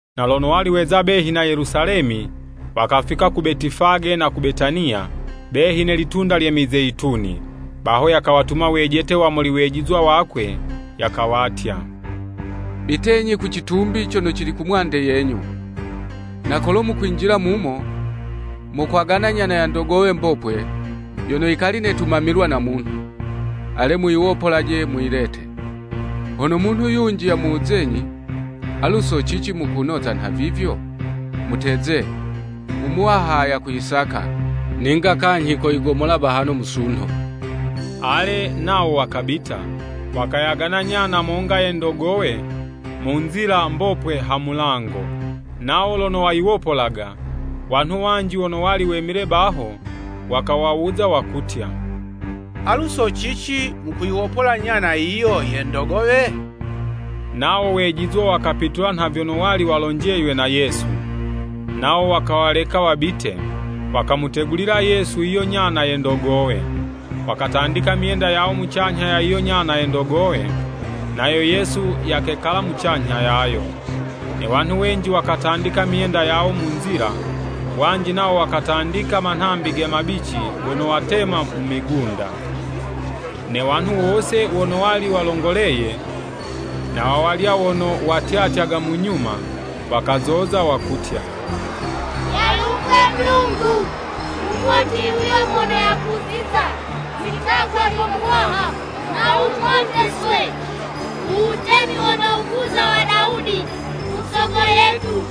Na lono wali weza behi na Yelusalemi, wakafika ku Betifage na ku Betaniya, behi ne Litunda lye Mizeyituni. Baho yakawatuma wejete wa muli wejizwa wakwe, yakawatya, “Bitenyi ku citumbi cono cili kumwande yenyu. Na kolo mukwinjila mumo, mokwagana nyana ya ndogowe mbopwe, yono yikali netumamilwa na munhu. Ale, muyiwopolelaje muyilete. Hono munhu yunji yamuwuzenyi, ‘Alu so cici mukunoza nhavivyo? “Muteze,” Umuwaha yakuyisaka, ninga kanyhi koyigomola bahano musunho.’” Ale, nawo wakabita, wakayagana nyana monga ye ndogowe mu nzila mbopwe ha mulango. Nawo lono wayiwopolaga, wanhu wanji wono wali wemile baho, wakawawuza wakutya, “Alu so cici mukuyiwopola nyana yiyo ye ndogowe?” Nawo wejizwa wakapitula nha vyono wali walonjeywe na Yesu, nawo wakawaleka wabite. Wakamutegulila Yesu yiyo nyana ye ndogowe. Wakatandika myenda yawo mucanyha ya yiyo nyana ye ndogowe, nayo Yesu yakekala mucanyha yayo. Ne wanhu wenji wakatandika myenda yawo mu nzila, wanji nawo wakatandika manhambi ge mabici gono watema mu migunda. Ne wanhu wose wono wali walongoleye, na wawalya wono watyatyaga mu nyuma, wakazoza wakutya, “Yalumbwe Mulungu! Mumoti yuyo mono yakuziza mwi'tagwa lyo Muwaha! Nha wumoteswe u wutemi wono wukuza wa Dawudi usogo yetu.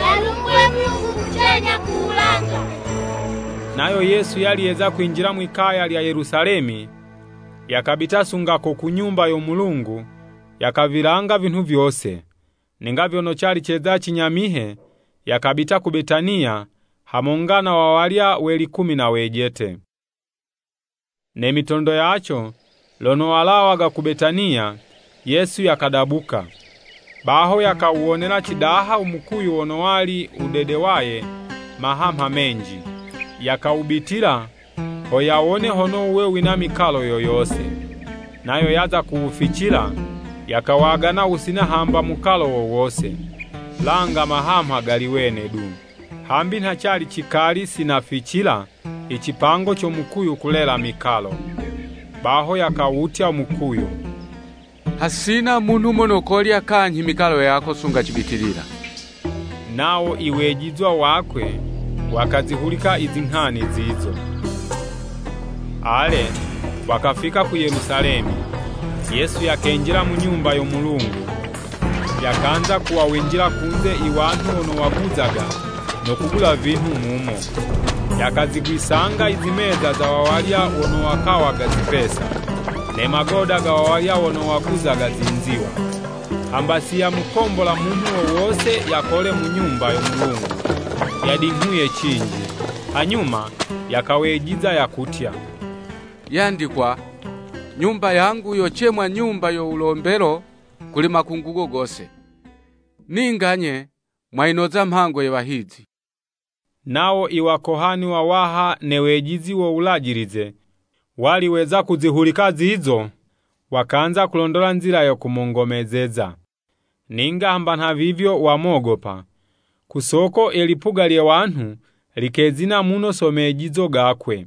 Yalumbwe Mulungu kucanyha ku wulanga!” Nayo Yesu yali yeza kwinjila mwi'kaya lya Yelusalemi, yakabita sunga ko ku Nyumba yo Mulungu, yakavilanga vinhu vyose. Ninga vyono cali ceza cinyamihe, yakabita ku Betaniya hamonga na wawalya we likumi na wejete. Ne mitondo yaco, lono walawaga ku Betaniya, Yesu yakadabuka. Baho, yakawuwonela cidaha u mukuyu wono wali wudedewaye mahamha menji. Yakawubitila ho yawone hono wuwe wina mikalo yo yose. Nayo yaza kuwuficila, yakawagana wusina hamba mukalo wo wose, langa mahamha gali wene du, hambi nha cali cikali sinaficila i cipango co mukuyu kulela mikalo. Baho yakawutya mukuyu, “Hasina munhu mono kolya kanyhi mikalo yako sunga cibitilila.” Nawo iwejizwa wakwe wakazihulika i zinghani zizo. Ale, wakafika ku Yelusalemi. Yesu yakenjila mu Nyumba yo Mulungu, yakanza kuwawinjila kunze i wanhu wono waguzaga no kugula vinhu mumo. Yakazigwisanga izimeza za wawalya wono wakawaga zipesa, ne magoda ga wawalya wono waguzaga zinziwa. Hamba si yamukombola munhu wo wose yakole mu Nyumba yo Mulungu yadinghuye cinji. Hanyuma yakawejiza, yakutya, “Yandikwa, ‘Nyumba yangu yocemwa nyumba yo wulombelo kuli makungugo gose! Ninga 'nye mwayinoza mhango ye wahizi!’” Nawo Iwakohani wawaha ne wejizi wo Wulajilize, wali weza kuzihulika zizo, wakanza kulondola nzila yo kumongomezeza. Ninga hamba nhavivyo wamogopa, ku soko i lipuga lye wanhu likezina muno so mejizo gakwe.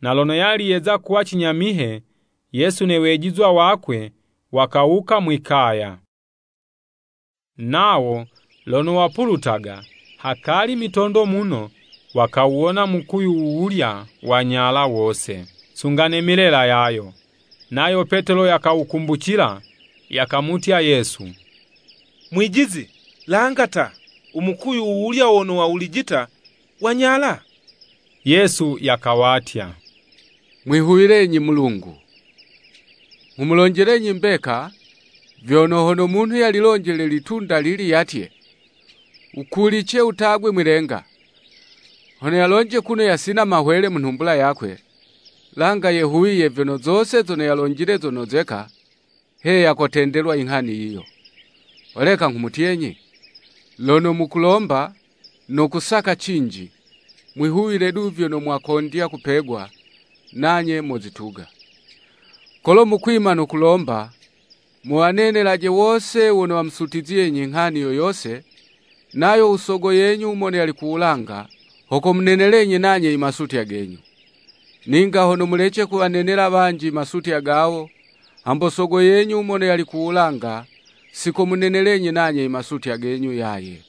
Na lono yali yeza kuwa cinyamihe, Yesu ne wejizwa wakwe wakawuka mwi'kaya. Nawo lono wapulutaga, hakali mitondo muno, wakawuwona mukuyu wuwulya wanyala wose, sunga ne milela yayo. Nayo Petelo yakawukumbucila, yakamutya Yesu, “Mwijizi, langa ta! Umukuyu wuwulya wono wawulijita, wanyala!” Yesu yakawatya, “Mwihuwilenyi Mulungu. Nghumulonjelenyi mbeka vyono, hono munhu yalilonjele litunda lili yatye, ‘Wukulice wutagwe mwi'lenga!’ Hono yalonje kuno yasina mahwele mu nhumbula yakwe, langa yehuwiye vyono zose zono yalonjile zonozeka, heya kotendelwa inghani yiyo. Holeka nghumutyenyi, lono mukulomba no kusaka cinji, mwihuwile du vyono mwakondya kupegwa, nanye mozituga. Kolo mukwima no kulomba, muwanenelaje wose wono wamusutizyenyi nghani yo yose, nayo u Sogo yenyu mono yali ku wulanga ho komunenelenyi nanye i masutya genyu. [ Ninga hono mulece kuwanenela wanji i masutya gawo, hambo sogo yenyu mono yali ku wulanga sikomunenelenyi nanye imasutya genyu yaye.]”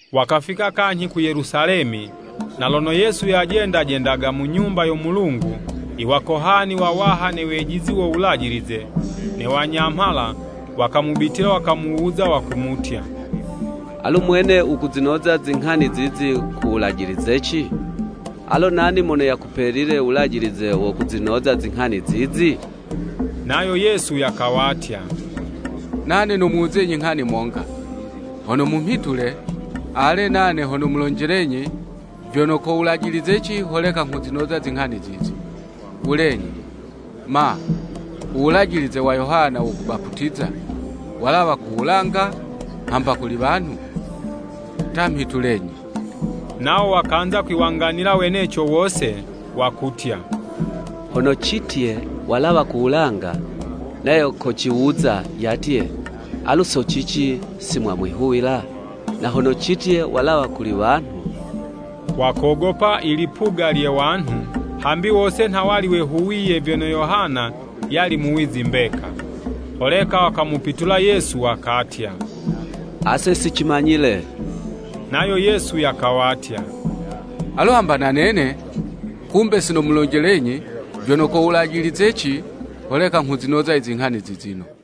Wakafika kanyhi ku Yelusalemi. Na lono Yesu yajenda jendaga mu Nyumba yo Mulungu, Iwakohani wawaha, ne wejizi wo Wulajilize, ne wanyamhala, wakamubitila, wakamuwuza, wakumutya, “Alu mwene wukuzinoza zinghani zizi ko wulajilizeci? Alo nani mono yakupelile u wulajilize wo kuzinoza zinghani zizi?” Nayo Yesu yakawatya, “Nane nomuwuzenyi nghani monga, hono mumhitule, ale, nane ho nomulonjelenyi vyono ko wulajilizeci holeka nghuzinoza zinghani zizi. Wulenyi, ma, u wulajilize wa Yohana wo kubaputiza walawa ku wulanga hamba kuli wanhu? Ta, mhitulenyi.” Nawo wakanza kwiwanganila weneco wose, wakutya, “Hono citye, ‘Walawa ku wulanga.’ Nayo kociwuza yatye, ‘Alu so cici simwamwihuwila?’ Na hono citye, ‘Walawa kuli wanhu!’” Wakogopa i lipuga lye wanhu, hambi wose nha wali wehuwiye vyono Yohana yali muwizi mbeka. Holeka wakamupitula Yesu wakatya, “Ase sicimanyile.” Nayo Yesu yakawatya, “Alu hamba na nene kumbe sinomulonjelenyi vyono ko wulajilizeci holeka nghuzinoza i zinghani zizino.”